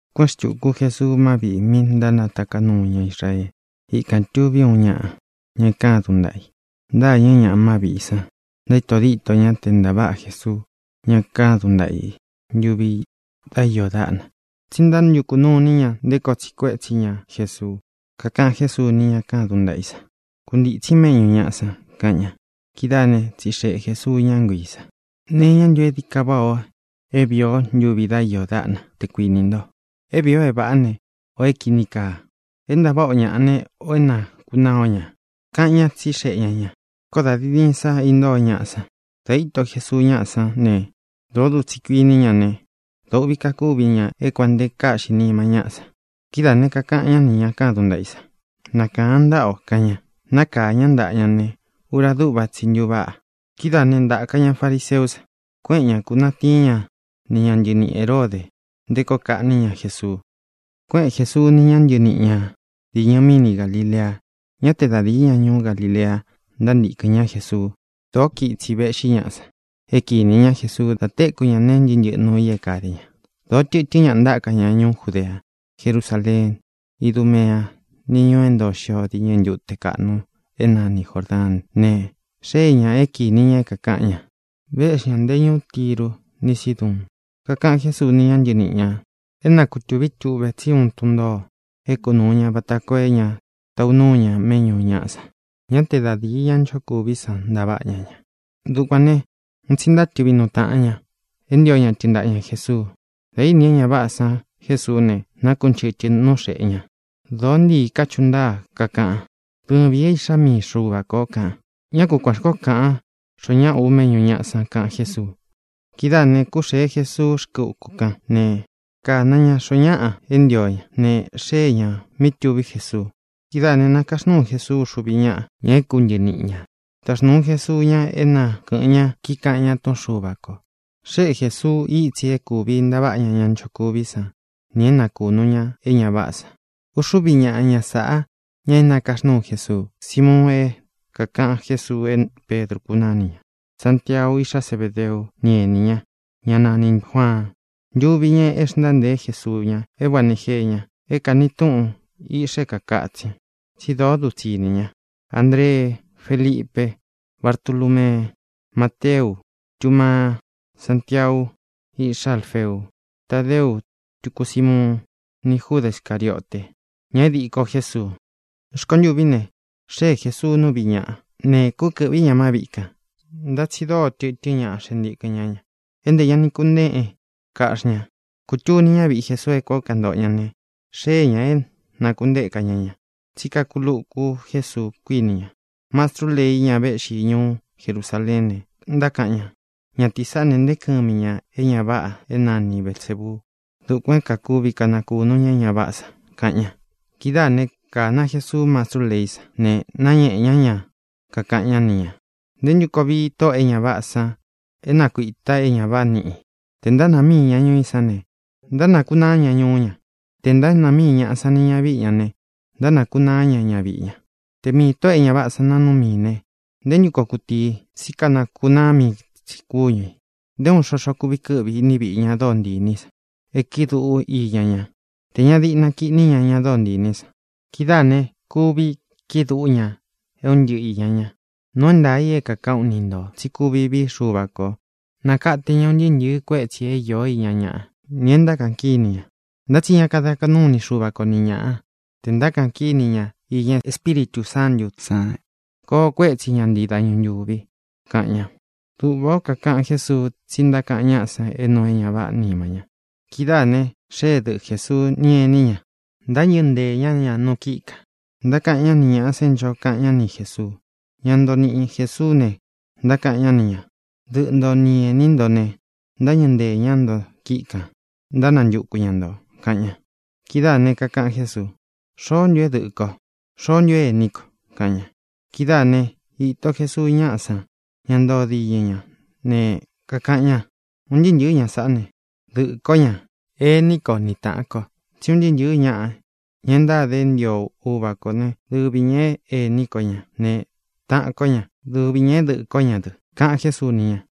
Kuéꞌen xtūku Jesuu má viꞌī mi ntánataká nuu ña Israee. Ikān tuví uun ñaꞌa, ña e kádun ntaꞌa i. Ntâñɨ́ ñaꞌa má viꞌī san, ntaíto díto ña te ntāváꞌa Jesuu ña kádun ntaꞌa i ntuvi dá iō dáꞌna. Tsí ntántukū nuu iní ña nté koo tsiꞌi kuétsi ña Jesuu. Kakaꞌan Jésuu ni ña kádun ntaꞌa i san: —Kuntītsín méꞌñū ñaꞌa san —kaꞌan ña. Kidáā né, tsixeꞌe Jēsuu ñá nguiī san: —¿Nee iñá ntu é dií ka váꞌā o é vīi o ntuvi dá iō dáꞌna, te kuinī nto: é vīi o é vāꞌá ne, ō é kīni kaa? ¿É ntaváꞌa o ñaꞌa ne, ō é nakunaa o ña? —kaꞌan ñá, tsixeꞌe ña ñā. Koó dā diin diin sa intóo ñaꞌa san. Dā íto Jesuu ñáꞌa san ne, dōó dutsi kuíni ña ne, dōo uꞌvi kakúvi ña é kuān nte káꞌxi nima ñáꞌa san. Kidáā ne, kakaꞌan ñá nī ña kádun ntaꞌa i san: —Nakāan ntáꞌa o —kaꞌan ña. Nákāa ñá ntaꞌa ña ne, ura dúꞌva tsi i ntuváꞌa. Kidáā né, ntāka ña fariseú san, kueꞌen ñá, kūnatiín ña ni ña ntɨniꞌi Hēródē nté koo kaꞌní ña Jesuu. Kuéꞌen Jēsuu ni ña ntɨníꞌi ñā diñɨ míni Galilea. Ñá te da dīi ña ñuú Galilea ntántīkɨn ñá Jesuu. Dōó kiꞌin itsi vēꞌxí ñaꞌa san é kinī ñá Jesuu da téku ña nee ntɨ́ꞌɨ ntɨꞌɨ nuu i é kade ña. Dōó tɨtɨ́n ñaꞌa ntáka ña ñuú Judea, Jerusáleen, Idúmeá, ni ñūu é ntoo xio diñɨ ntute kaꞌnu é nani Jōrdaán ne, xée ñā é kīni ña é kākaꞌan ña. Véꞌxi ñā nte ñúú Tiru ni Síduun. Kakaꞌan Jésuu ni ña ntɨníꞌi ñā é na kutūví tuꞌve tsi úun tun ntōo é kunūu ña vata koo é ña taꞌu núu ña méꞌñū ñaꞌa san. Ñá te da dīi ñá nchokuví san ntaváꞌa ña ña. Dukuān ne, un tsi ntátɨꞌvi nuu taꞌan ña é ntio ña tɨɨn ntaꞌa ña Jēsuu. Dā íni é ña váꞌā san Jésuú ne, nákunchɨtɨ̄ nú xeꞌe ña. Dōó ntiī kachuꞌu ntáa, kakaꞌan: —Dɨvīn é Iꞌxá mii Xuva ko ō —kaꞌan. —Ñá ku kuān xkoó kaꞌan xoó ñaꞌa u méꞌñū ñaꞌa san —kaꞌan Jésuu. Kidáā ne, kúxēe Jesuu rkɨ́ uku kán ne, kāna ña xoó ñaꞌa e ntío ña. Ne, xée ñā mí tuví Jesuu. Kidáā ne, nákaxnuu Jesuu uxuvi ñáꞌa, ña é kuntɨniꞌi ñā. Taxnūu Jesuu ña é na kɨ̄ꞌɨn ña, kíkaꞌan ña túꞌun Xuva kō. Xéꞌe Jēsuu ítsi é kūvi ntaváꞌa ña ña ntánchokuví san nī é nakūnu ña é ña váꞌā san. Uxúvi ñaꞌa ña sāꞌa, ña é nakaxnúu Jesuu: Simuun, é kākaꞌan Jésuu é Pedru kunáni ña; Santiau, iꞌxá Zebedeú, ni enī ña, ñá nanī Juaan, ntuvi ña é xntántēe Jesuu ña é Boanege ña, é kāni túꞌun Iꞌxa É Kākatsin, tsí dóo dutsi ini ña; Andree, Félipe, Bartulúmee, Máteu, Túmaa, Sántiau, iꞌxá Alfeu, Tádeu, tuku Símuun; ni Júda Scarīote, ña é diko Jésuu. Rkontûví ne, xée Jēsuu nú viꞌī ñaꞌa ne, kúkɨ̄ꞌví ñā má viꞌi kān. Ntá tsi dóo tɨtɨ́n ñaꞌa xee ntikɨn ñá ña, é ntē ña ni kunéꞌe kaꞌxí ña. Kūtuni ñáviꞌi Jesuu é kuān ó kantoꞌo ña ne, xée ñā é nākuntéka ña ña, tsí kakuluku Jésuu, kuíni ña. Mastrú lei, ña véꞌxi ñuú Jerusaleén ne, ntákaꞌan ña: —Ñatīí saꞌá ne, nteé kɨmi ña īña é ña váꞌā é nani Belsēbuu. Dukuān é kakuvi kanakūnu ña é ña váꞌā san —kaꞌan ña. Kidáā né, kāna Jesuú mastrú leí san ne, náñēꞌe ñá ña, kakaꞌan ñá ni ñā: —¿Nté ntu koo vii tóꞌō e ña váꞌā san é nakuīta é ñā váꞌa niꞌi ī? Tē ntánāa míi ña ñuu i sán ne, ntánakunaá ña ñuú ña. Tē ntánāa míi ñaꞌa sán nī ñavíꞌi ña ne, ntánakūnaá ña ñaviꞌi ña. Te miī tóꞌō e ña váꞌā san naa núu miī ne, ¿nté ntu koo kutíi i? Tsí kanakunaa mii tsi kúñu ī. ʼNté uun xoxo kuvi kɨ́ꞌvi i iní viꞌi ña dóo ntii inī í san é kiꞌi dúꞌu iña ñá tē ña diꞌna kiꞌní ña ña dóo ntii inī í san. Kidáā ne, kuvi kiꞌi dúꞌu ña é un ntɨꞌɨ īña ña. ʼNuu é ntaā i é kākaꞌán u ni ntō tsí kuvi vií Xuva ko nākate ña un ntɨɨ́ ntɨ̄ɨ kuétsī é īó iña ñaꞌa, nī é ntákaꞌan kíni ña. Ntá tsi ña kada kaꞌnú ini Xuva ko ni ñāꞌa te ntákaꞌan kíni ña iña Espíritū Sántū san. Koo kuétsi ña ntii dañu ntūvi —kaꞌan ña. Duꞌvā ó kakaꞌan Jésuu, tsí ntákaꞌan ñáꞌa san é nuu é ña váꞌā nima ña. Kidáā ne, xée dɨꞌɨ Jēsuu ni ení ña. Ntáñɨ̄ ntée ña ña nu kíꞌi kān, ntákaꞌan ñá ni ñāꞌa san é ncho kaꞌan ñá ni Jēsuu. Ña ntoo niꞌi Jēsuú ne, ntákaꞌan ñá ni ñā: —Dɨꞌɨ nto ni enī ntó ne, ntáñɨ̄ ntée ña nto kíꞌi kān, ntánantuku ña ntō —kaꞌan ña. Kidáā ne, kakaꞌan Jésuu: —¿Xoó ntu é dɨꞌɨ̄ ko? ¿Xoó ntu é ēní ko? —kaꞌan ña. Kidáā né, īto Jesuu ñáꞌa san, ña ntoo diñɨ ña ne, kakaꞌan ña: —Un ntɨɨ́ ntɨ̄ɨ́ ña sāꞌá ne, dɨꞌɨ̄ kó ña, ení ko ni tāꞌan ko. Tsí un ntɨɨ́ ntɨ̄ɨ́ ñaꞌa, ña e ntáde é ntio Uva kó ne, dɨvi ñā é ēní ko ña ne, taꞌan kó ña; dɨvi ñā é dɨꞌɨ̄ kó ña dɨ —kaꞌan Jésuu ni ña.